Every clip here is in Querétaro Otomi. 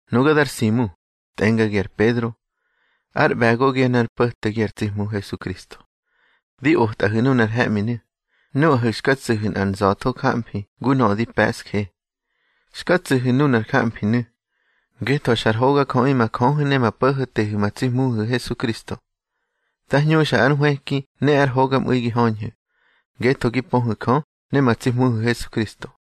Nuga dar Simu, tꞌengagi ar Pedro, ár ꞌbe̱gogi ne ár mpo̱tegi ar tsi Hmu Hesukristo. Di otꞌahu̱ nunar he̱ꞌminu̱ nuꞌahu̱ xka tsu̱hu̱ nꞌar nza̱tho jamfi ngu nöꞌö di pe̱ꞌsje. Xka tsu̱hu̱ nunar jamfinu̱, ngetho xa ar hogajöꞌi ma Jöhu̱ ne ma Po̱ho̱tehu̱ ma tsi Hmuhu̱ Hesukristo. Dá hñuxa ar nhwëki ne ar hogamꞌu̱i gi höñhu̱, ngetho gi pöhu̱ Jö ne ma tsi Hmuhu̱ Hesukristo.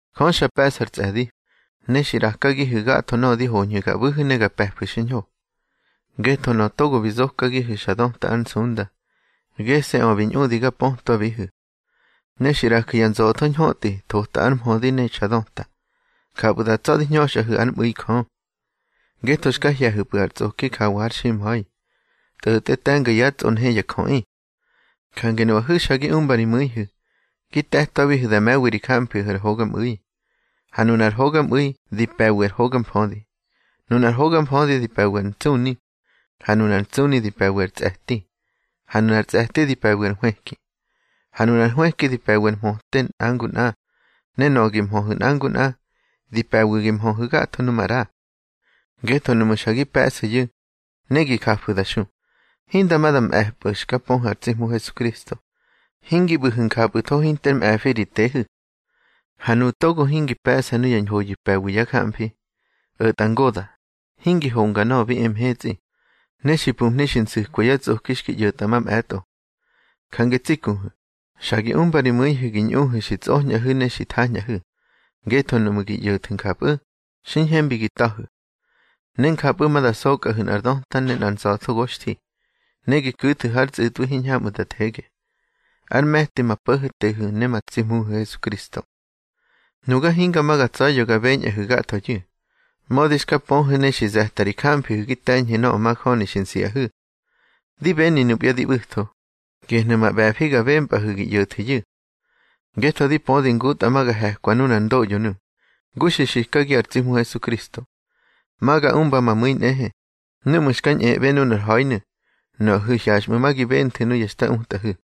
Jö xa pe̱ꞌsa ár tsꞌe̱di, ne xi ꞌrakagihu̱ gatho nöꞌö di hoñhu̱ ga ꞌbu̱hu̱ ne ga pe̱fu̱ xiñho, ngetho nöꞌö togo bi zokagihu̱ xa döta ár nsunda, gese̱ꞌö bi ñꞌudi ga pötwabihu̱. Ne xi ꞌraju̱ ya nza̱tho ñhötꞌi thota ár mhödi ne xa döta. Njapꞌu̱ da tsa̱ di hñöxꞌahu̱ ár mꞌu̱i Jö, ngetho xka hye̱hu̱pꞌu̱ ar tsꞌoki jawa har ximha̱i, tꞌo̱tꞌe te̱nga yá tsꞌonhe ya jöꞌi. Jange nuꞌahu̱ xa gi umba ri mu̱ihu̱ gi te̱twabihu̱ da me̱wi ri jamfihu̱ ar hogamꞌu̱i, ha nunar hogamꞌu̱i di pe̱wi ar hoga mfödi. Nunar hoga mfödi di pe̱wi ar ntsꞌuni, ha nunar ntsꞌuni di pe̱wi ar tsꞌe̱ti, ha nunar tsꞌe̱ti di pe̱wi ar nhwëki. Ha nunar nhwëki di pe̱wi ar mhöte nꞌa ngu nꞌa, ne nöꞌö gi mhöhu̱ nꞌa ngu nꞌa, di pe̱wi gi möhu̱ gatho nu maꞌra. Ngetho nuꞌmu̱ xa gi pe̱ꞌsu̱yu̱, ne gi jafu̱ da xu, hinda ma da mꞌe̱pꞌu̱ xka pöhu̱ ar tsi Hmu Hesukristo, hingi ꞌbu̱hu̱ njapꞌu̱tho hinter mꞌe̱fi ri tehu̱. Ha nuꞌu̱ togo hingi pe̱ꞌsa nuya ñhoyu̱ pe̱wi yá jamfi, o̱tꞌa ngoda̱, hingi honga nöꞌö bi e mhetsꞌi, ne xi pumhni xi nsu̱kwa yá tsꞌoki xki ꞌyo̱tꞌa mamꞌe̱tꞌo. Jange tsi kuhu̱, xa gi umba ri mu̱ihu̱ gi ñꞌuhu̱ xi tsꞌoñꞌahu̱ ne xi thañꞌahu̱, ngetho nuꞌmu̱ gi ꞌyo̱thu̱ njapꞌu̱, xi ñhembi gi ta̱hu̱. Ne njapꞌu̱ ma da sokꞌahu̱ nꞌar döta ne nza̱tho goxthi, ne gi ku̱thu̱ har tsꞌu̱tꞌwi hiñhamꞌu̱ da thege, ár me̱ti ma Po̱ho̱tehu̱ ne ma tsi Hmuhu̱ Hesukristo. Nuga hinga ma ga tsa̱ya̱ ga beñꞌahu̱ gathoyu̱, mödi xka pöhu̱ ne xi ze̱tꞌa ri jamfihu̱ gi te̱ñhu̱ nöꞌö majöni xi nsiꞌahu̱. Di beni nupya di ꞌbu̱tho, gehnu̱ ma ꞌbe̱fi ga bempꞌahu̱ gi ꞌyo̱thu̱yu̱. Ngetho di pödi ngutꞌa ma ga he̱kwa nunar ndoꞌyonu̱, ngu xi xikagi ar tsi Hmu Hesukristo. Ma ga umba ma mu̱i nꞌehe, núꞌmu̱ xka ñꞌeꞌbe nunar ha̱inu̱, nuꞌahu̱ hyaxꞌmu̱ gi benthu̱ nuya xta utꞌahu̱.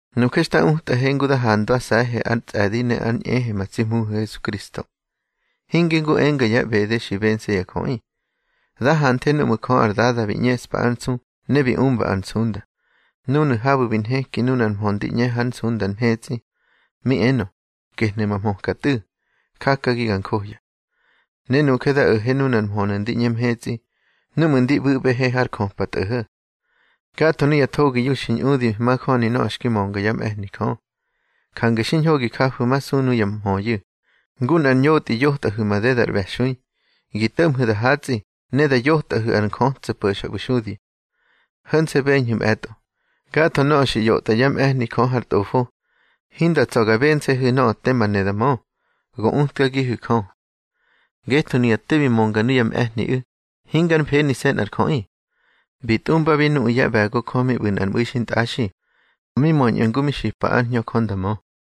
Nuje xta utꞌahe ngu da handwase̱he ár tsꞌe̱di ne ár ꞌñehe ma tsi Hmuhu̱ Hesukristo, hinge ngu enga ya ꞌbede xi bense̱ ya jöꞌi. Da hanthe núꞌmu̱ Jö ar Dada bi ꞌñeꞌspa ár nsu ne bi umba ar nsunda, núnu̱ habu̱ bi nheki nunar mhö ndi ꞌñe har nsunda mhetsꞌi, mi enö: Gehnu̱ ma hmöka Tꞌu̱, jakagi ga njohya. Ne nuje da o̱he nunar mhönu̱ ndi ꞌñe mhetsꞌi núꞌmu̱ ndi ꞌbu̱ꞌbehe har jöpa tꞌo̱ho̱. Gatho nuya thogiyu̱ xi ñꞌudi majöni nöꞌö xki mönga yá mꞌe̱hni Jö. Jange xiñho gi jafu̱masu nuya mhöyu̱, ngu nꞌar ñotꞌi yotꞌahu̱ madeda ar ꞌbe̱xui, gi to̱ꞌmhu̱ da hatsꞌi ne da yotꞌahu̱ ar njötso̱ po̱xa ꞌbu̱ xudi. Ho̱nse̱ beñhu̱ mꞌe̱tꞌo, gatho nöꞌö xi ꞌyotꞌa yá mꞌe̱hni Jö har Tꞌofo, hinda tsa̱ ga bense̱hu̱ nöꞌö tema ne da mö, go utkagihu̱ Jö. Ngetho nuya te bi mönga nuya mꞌe̱hniꞌu̱, hingar mfenise̱ nꞌar jöꞌi. Bi tꞌumbabi nuꞌu̱ yá ꞌbe̱go Jö mi ꞌbu̱ nꞌar mꞌu̱i xintꞌaxi, mi möñꞌu̱ ngu mi xipa ár Hñö Jö nda mö.